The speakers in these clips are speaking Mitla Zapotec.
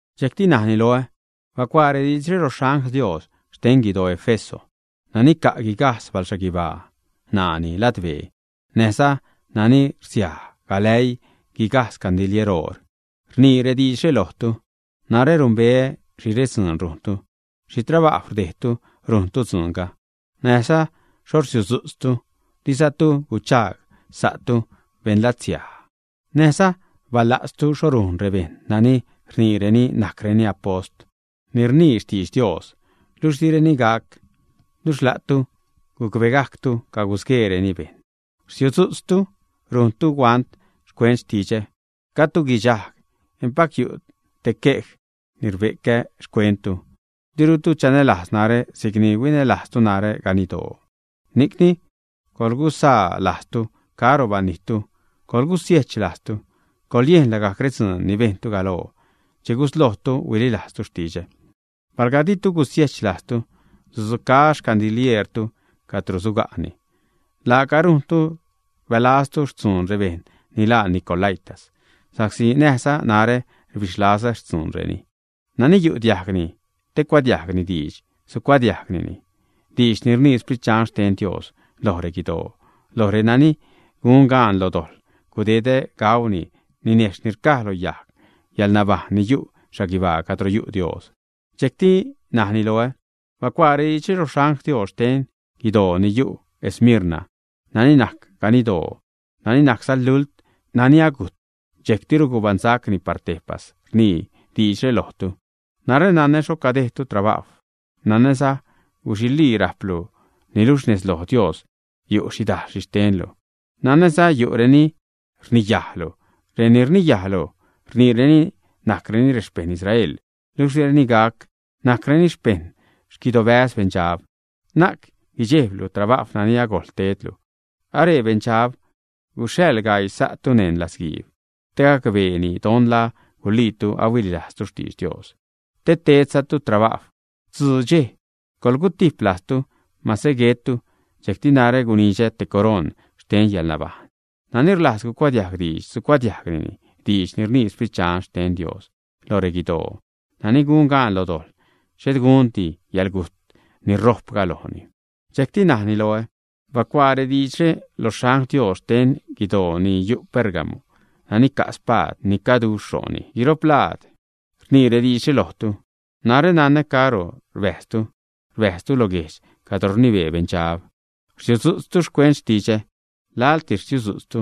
Dxejcti najni loä: ―Bacuaa rediidxre lo xangl Dios xten guidoo Éfeso: “Nani ca' guigajdz balxhaguibaa ṉaani ladbee, näjza nani rsiaj galäii guigajdz gandilier oor, rnii rediidxre lojtu: Narä numbeä xhi redzuun rujntu, xhi trabajw rdejdtu rujntu dzuunga, näjza xho rsiudzu'tztu. Dizatu guchagsa'tu beṉlatsiaj; näjza bala'tztu xho rujn rebejṉ nani rniireni najcreni apost ni rnii xtidx Dios, luxh direni gac, luxh la'tu gucbegajctu cagusgueereni bejṉ. Rsiudzu'tztu, rujntu huant xcuent xtidxä, gajdtu guidxajg. Empac yu' te quej ni rbe'cä xcuenttu: dirutu chanälajz narä si'cni huinälajztu narä ganiddoo. Ni'cni coḻguzaa lajztu caro banijttu, coḻgusiejch lajztu, coḻyejn lagajc redzuun ni bejntu galoo che guslojtu huililajztu xtidxä. Palga ditu gusiechlajztu, sudzucaä xcandilieertu cadro suga'ni. Laaca rujntu rbälaztu xtzuun rebejṉ ni laa nicolaítas, sa'csi näjza narä rbixlazä xtzuunreni. Nani yu' diajgni te cuadiajgni diidx, sucuadiajgni diidx ni rnii Sprit Dxan xten Dios loj reguidoo: loj renani gun gaan lo dojḻ, gudedä gauni ninejxh ni rcaj lo yajg yäḻnabajṉ, ni yu' xhaguibaa cadro yu' Dios.” Dxejcti najni loä: ―Bacuaa rediidxre lo xangl Dios xten guidoo ni yu' Esmirna: “Nani najc ganiddoo, nani najcza lult, nani agujt, dxejctiru gubaṉsacni par tejpas, rnii diidxre lojtu: Narä nanä xho cadejdlu trabajw, nanäza guxilii rajplu, niluxh nez loj Dios yu' xhidajl xhixtenlu. Nanäza yu'reni rniyajlu. Reni rniyajlu rniireni najcreni rexpejṉ Israel, luxh direni gac. Najcreni xpejṉ xquidobäz beṉdxab. Na'c guidxejblu trabajw nani agojl tedlu. Aree beṉdxab gusäḻ gaii sa'tu neṉ latzguiib, te gacbeeni don la guliitu ahuililajztu xtidx Dios, te tedzatu trabajw tzuu dxej. Coḻgutip lajztu mase guettu, dxejcti narä gunidxä te coroṉ xten yäḻnabajṉ. Nani rlajz cuadiajg diidx sucuadiajgni diidx ni rnii Sprit Dxan xten Dios loj reguidoo: nani gun gaan lo dojḻ, xhet gundi yäḻgujt ni rojpga lojni.” Dxejcti najni loä: ―Bacuaa rediidxre lo xangl Dios xten guidoo ni yu' Pérgamo: “Nani ca' spaad ni caduxh ro'ni guiro'p laad rnii rediidxre lojtu: Narä nanä caro rbäjztu, rbäjztu lo guejdx cadro rnibee Beṉdxab. Rsiudzu'tztu xcuent xtidxä. Laḻtis rsiudzu'tztu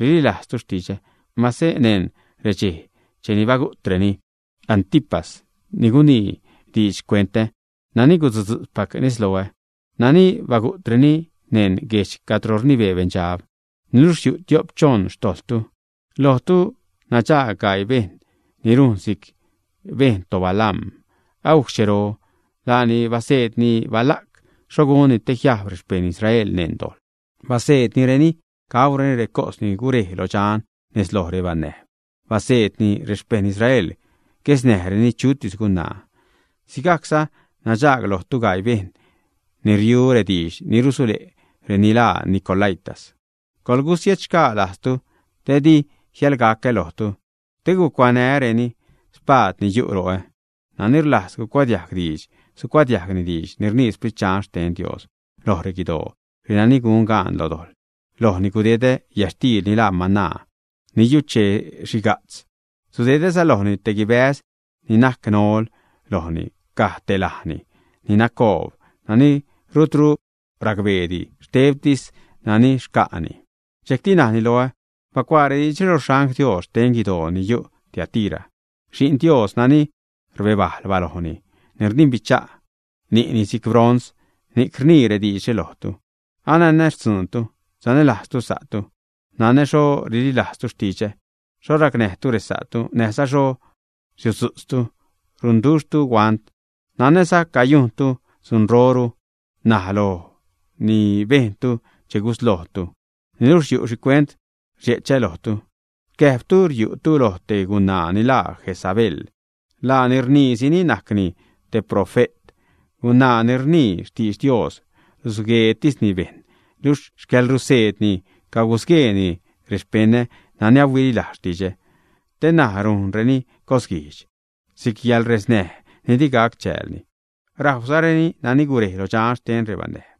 rililajztu xtidxä, mase neṉ redxej cheni bagu'treni Antipas, ni gunii diidx xcuenta, nani gusudzutzpac nez loä, nani bagu'treni neṉ guejdx cadro rnibee Beṉdxab. Niluxh yu' tiop-choṉ xtojḻtu. Lojtu nadxaag gaii bejṉ ni rujn si'c bejṉ toBalaam agujc xchero. Laani baseedni Balac xho gunni te jiajb rexpejṉ Israel neṉ dojḻ, baseednireni gaureni recos ni gurej lo dxan nez loj rebanäjb, baseedzani rexpejṉ Israel guesnäjreni chutis gunaa. Sigajcza nadxaag lojtu gaii bejṉ ni riu rediidx ni rusule' reni laa nicolaítas. Coḻgusiechxgaa lajztu, te di jiäḻgacä lojtu te gucuanää́reni spaad ni yu' ro'ä. Nani rlajz cuadiajg diidx, sucuadiajgni diidx ni rnii Sprit Dxan xten Dios loj reguidoo: renani gun gaan lo dojḻ, lojni gudedä yätxtiil ni laa mana ni yuchee-xhiga'tz. Sudedäza lojni te guibäz ni najc nol, lojni caj te lajni ni nacoob, nani rutru racbeedi, xtebtis nani xca'ni.” Dxejcti najni loä: ―Bacuaa rediidxre lo xangl Dios xten guidoo ni yu' Tiatira: “Xi'n Dios nani rbebajl balojni, ni rdimbicha' ni'ni si'c bronz, ni'c rnii rediidxre lojtu: Ananä xtzuuntu, sanälajztu sa'tu, nanä xho rililajztu xtidxä, xho racnäjtu resa'tu, näjza xho rsiudzu'tztu, runduxhtu huant. Nanäza cayujntu dzunroru ṉaj loj ni bejntu che guslojtu. Niluxh yu' xhicuent rdxe'chä lojtu. Rcäjbtu riu'tu loj te gunaa ni laa Jezabel. Laani rniisini najcni te profe't, gunaa ni rnii xtidx Dios, rusgueetisni bejṉ. Luxh xcäḻruseedni cagusgueeni rexpeṉä nani ahuililajz xtidxä, te ṉaj rujnreni cosguijdx, si'c yäḻresnäj ni di gac chäälni, rajwzareni nani gurej lo dxan xten rebanäjb.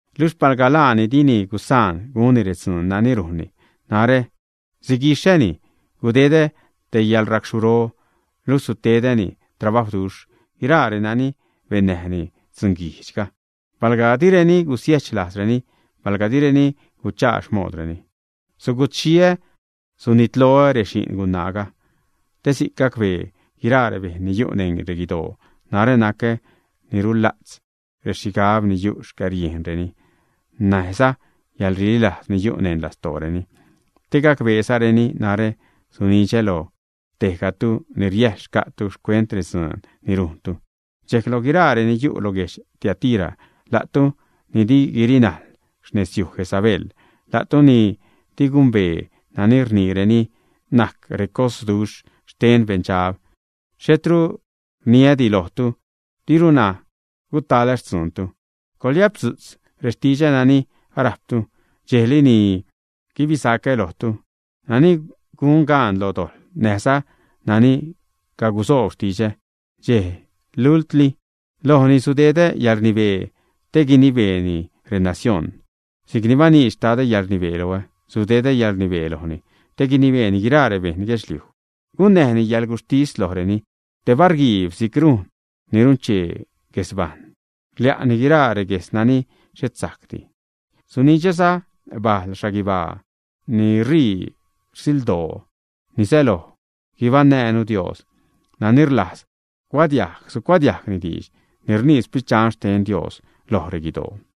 Luxh palga laani dini gusaan gunni redzuun nani rujnni, narä siguixäni, gudedä te yäḻracxhuro. Luxh sutedä trabajwduxh guiraa renani bennäjni dzunguijdx palga direni gusiejch lajzreni, palga direni guchaa xmoodreni. Sugutxhiä, sunitloä rexi'n gunaaga, te si'c gacbee guiraa rebejṉ ni yu' neṉ reguidoo narä nacä ni rula'tz rexhigab ni yu' xcäriejnreni, näjza yäḻrililajz ni yu' neṉ lastooreni. Te gacbeezareni narä sunidxä lo tejgatu ni riäjḻ xca'tu xcuent redzuun ni rujntu. Dxejc loj guiraa reni yu' lo guedx Tiatira, la'tu ni di guirinajl xnezyuj Jezabel, la'tu ni di gumbee nani rniireni najc recosduxh xten beṉdxab, xhetru rniädi lojtu, dirunä gutalä xtzuuntu. Coḻyapdzu'tz rextidxä nani arajptu dxejli ni guibisacä lojtu. Nani gun gaan lo dojḻ, näjza nani cagusoob xtidxä dxe lultli, lojni sudedä yälrnibee te guinibeeni renacioṉ. Si'cni baniidx Xtadä yäḻrnibee loä, sudedä yäḻrnibee lojni, te guinibeeni guiraa rebeṉ guedxliuj, gunnäjni yäḻguxhtis lojreni te barguiib si'c rujn ni runchee guesbajṉ, rlia'ni guiraa regues nani xhet sajcdi. Sunidxäza bale' xhaguibaa ni rii rsildoo (ni säloj guibaṉnäjnu Dios). Nani rlajz cuadiajg sucuadiajgni diidx ni rnii Sprit Dxan xten Dios loj reguidoo.”